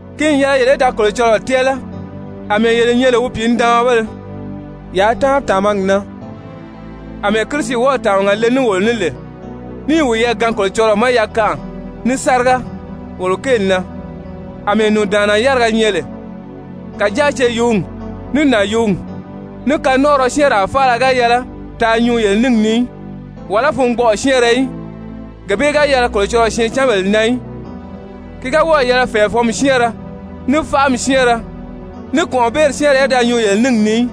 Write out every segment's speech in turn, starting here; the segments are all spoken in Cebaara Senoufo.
Ki n yɛlɛ yele í da Kolocɔlɔɔ tɛ́ɛlɛ àmɛɛ yele nyɛ lè wi pìinidaanmabéle, yaa táanri tàmagi na àmɛɛ Kirisi wɔ́ɔ̀ tàmaga le ní wolo ní lè níì wiyɛɛ gaan Kolocɔlɔɔ ma yakanʔa ní sáriga, wolo kéeli na àmɛɛ nùndaanna yáriga nyɛ lè. Kàjáa ceyuugi, ní nànyuugi, ní kanɔnʔɔrɔ syɛ́ɛnraa faala ga yɛlɛ taa nyuu yele níngi ni í, wàlá fungbɔʔɔ syɛ́ɛnrɛ í, gee bee ga yɛlɛ Kolocɔlɔɔ syɛɛncanbèle na í. Ki ga wɔ́ɔ̀ yɛlɛ fɛ̀ɛfɔnmi syɛ́ɛnrɛ, ní faʔami syɛ́ɛnrɛ, ní kɔ̀nʔɔbeeri syɛ́ɛnrɛ í da nyuu yele níngi ni í,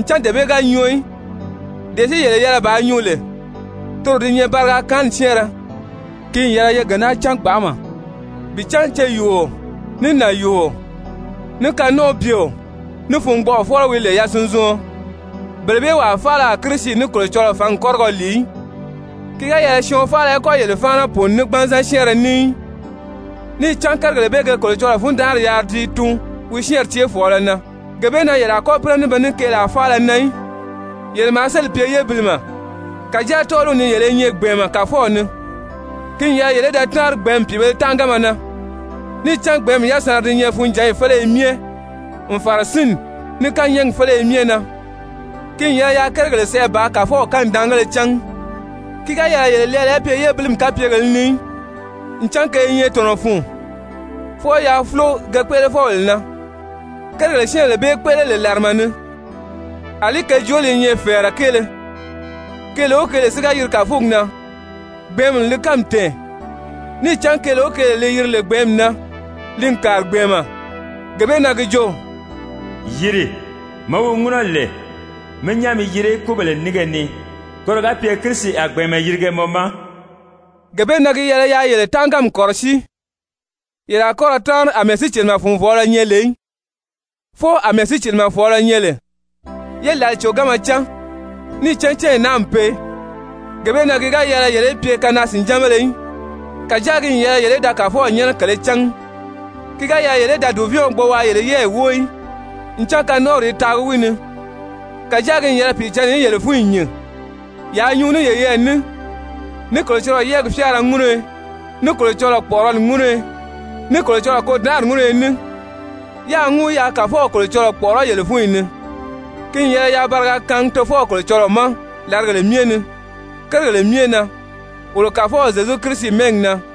ncan dee bee ga nyɔɔ í. Dee si yele yɛlɛ bàā nyuu lè, toro di nyɛ bariga kaanni syɛ́ɛnrɛ. Ki n yɛlɛ ye gee naa cán gbanʔama bi cán ceyuuo, ní nànyuuo, ní kanɔnʔɔbyeo, ní fungbɔʔɔfɔlɔ wi lè yasunzuɔn, bele bee wàa faala a Kirisi ní Kolocɔlɔɔ fǎngi kɔ́rigɔ lìi í. Ki ga yɛlɛ syɔɔn faala í kɔ́ yele fáana pùuni ní gbanzan syɛ́ɛnrɛ ní í, níì cán kérigèle bee ge Kolocɔlɔɔ fundanʔari yaari ti i tuun wi syɛ́ɛnri céefɔɔlɔ na. Gee bee na yele a kɔ́ pínɛ ní be ní keelaa faala na í. Yele maa sélì pye yébilimɛ, kàjáa tɔ́ɔliw ni yele i nyɛ gbɛ̀ɛnmɛ Kàfɔw ni. Ki n yɛlɛ yele í da táanri gbɛ̀ɛ́nmi pìibēle tánʔaganma na. Níì cán gbɛ̀ɛ́nmi yasanra di nyɛ funjǎnyi féleye myɛ n fàra sínni, ní kányɛɛgi féleye myɛ na. Ki n yɛlɛ yaa kérigèle sɛʔɛ bàā Kàfɔw kanidaangéle cángi. Ki ga yɛlɛ yele lɛɛlɛ í pye yébilimi kapyegèlē ni í, ncan ke i nyɛ tɔ̀nɔ fun, fwɔɔ yaa fúlo ke kpéʔelefɔbèle na. Kérigèle syɛ́ɛnbèle bee kpéʔele lè làrama ni, àlí ke jooli i nyɛ fɛ̀ɛrɛ kéele. Keele o keele si ga yiri kàfugi na, gbɛ̀ɛ́nmi n li kánmi tɛ̀ɛn. Níì cán keele o keele li yiri lè gbɛ̀ɛ́nmi na, li n kàri gbɛ̀ɛnmɛ. Gee bee na gi jo: «Yìri, mɔ wi ŋúnɔ lè, mi nyán mi yiri kúbèle nínge ni, koro ga pye Kirisi a gbɛ̀ɛnmɛ yirige mɔ ma.» Gee bee na gi yɛlɛ yaa yele tánʔaganmi kɔ̀rɔsíi, yele a kɔ́ ra táanri àmɛɛ sícilimɛ-fùnvɔɔlɔ nyɛ lè í, fwɔɔ àmɛɛ sícilimɛfɔɔlɔ nyɛ lè. Ye lǎli còganma cán, níì cán cányi naa n pee. Gee bee na ki ga yɛlɛ yele í pye kanaa-sìnjánbéle í, kàjáa ki n yɛlɛ yele í da Kàfɔw nyɛ́nɛ kèlē cángi. Ki ga yɛlɛ yele í da dùvɛɛnw gbo waa yele yɛ́ɛyi wóo í, ncan kanɔnʔɔri i taagi wi ni. Kàjáa ki n yɛlɛ Pìicǎnni í yele fúnyi nyìn. Yaa nyuu ní yeyɛɛ ní ní Kolocɔlɔɔ yɛ́ɛgi fyáara ŋúnuyo, ní Kolocɔlɔɔ kpɔ̀ʔɔrɔli ŋúnuyo, ní Kolocɔlɔɔ kôdanʔari ŋúnuyo ní, yáā ŋúu yaa Kàfɔw Kolocɔlɔɔ kpɔ̀ʔɔrɔ́ yele fúnyi ni. Ki n yɛlɛ yaa bariga kaangi Tofɔw Kolocɔlɔɔ ma làrigèle myɛ ni kérigèle myɛ na wolo Kàfɔw Zyezu Kirisi mɛ́ɛgi na.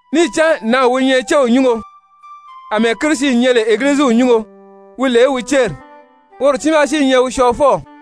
Níì cán nǎnw wi nyɛ céw nyúngo, àmɛɛ Kirisi nyɛ lè Egiliziw nyúngo wi lè wi céri, woro tiimaa si i nyɛ wi Syɔɔfɔw.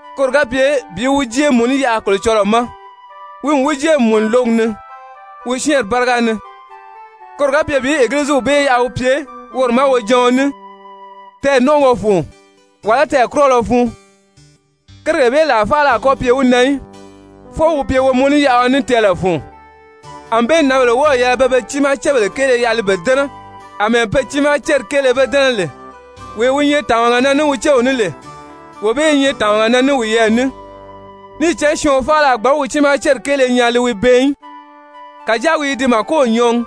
koro ga pye bi wi jée mùnú yaʔa Kolocɔlɔɔ ma, wi n wi jée n mùnu lǒgi ni, wi syɛ́ɛnri báriga ni, koro ga pye bi Egiliziw bee yaʔa wi pye woro ma wojaɔn ní, tɛɛ̀nɔnʔɔgɔ fun, wàlá tɛɛ̀kurɔlɔ fun, kérigèle bee làa faala a kɔ́ pye wi na í, fwɔɔ wi pye womunuyaʔaɔ ní tɛɛlɛ fun. Anbée nǎnbèle wɔ́ɔ̀ yɛlɛ pe be tiimaa cébèle kéele yaʔa li be dɛ́nɛ àmɛɛ pe tiimaa céri kéele be dɛ́nɛ lè. Wee wi nyɛ tàmaga na ní wi céw ní lè, wee bee i nyɛ tàmaga na ní wiyɛɛ ní. Níì cán syɔɔn faala a gbǎn wi tiimaa céri kéele nyaa li wi bɛɛn í, kàjáa wi i di màkow nyɔɔgi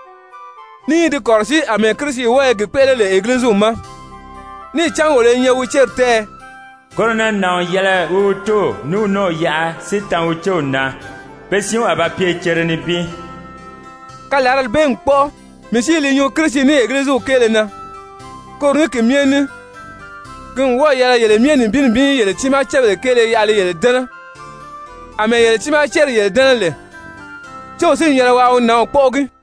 ní i di kɔ̀rɔsíi àmɛɛ Kirisi wɔ́ɔ i gi kpéʔele lè Egiliziw ma. Níì cán wolo i nyɛ wi céri tɛ́ɛyɛ. «Koro na nàɔn n yɛlɛ wi wi tóow ní wi nɔ́ɔw yaʔa si tan wi céw na, pe siinw a ba pye cere nibin.» Kalarali bee n kpɔ́ʔɔ. Mii si i li nyuu Kirisi ní Egiliziw kéele na. Koro ní ki myɛ ní ki n wɔ́ɔ̀ yɛlɛ yele myɛ nibin nibin í yele tiimaa cébèle kéele yaʔa li yele dɛ́nɛ àmɛɛ yele tiimaa céri yele dɛ́nɛ lè, céw si n yɛlɛ waa wi nǎnw kpɔ́ʔɔgi.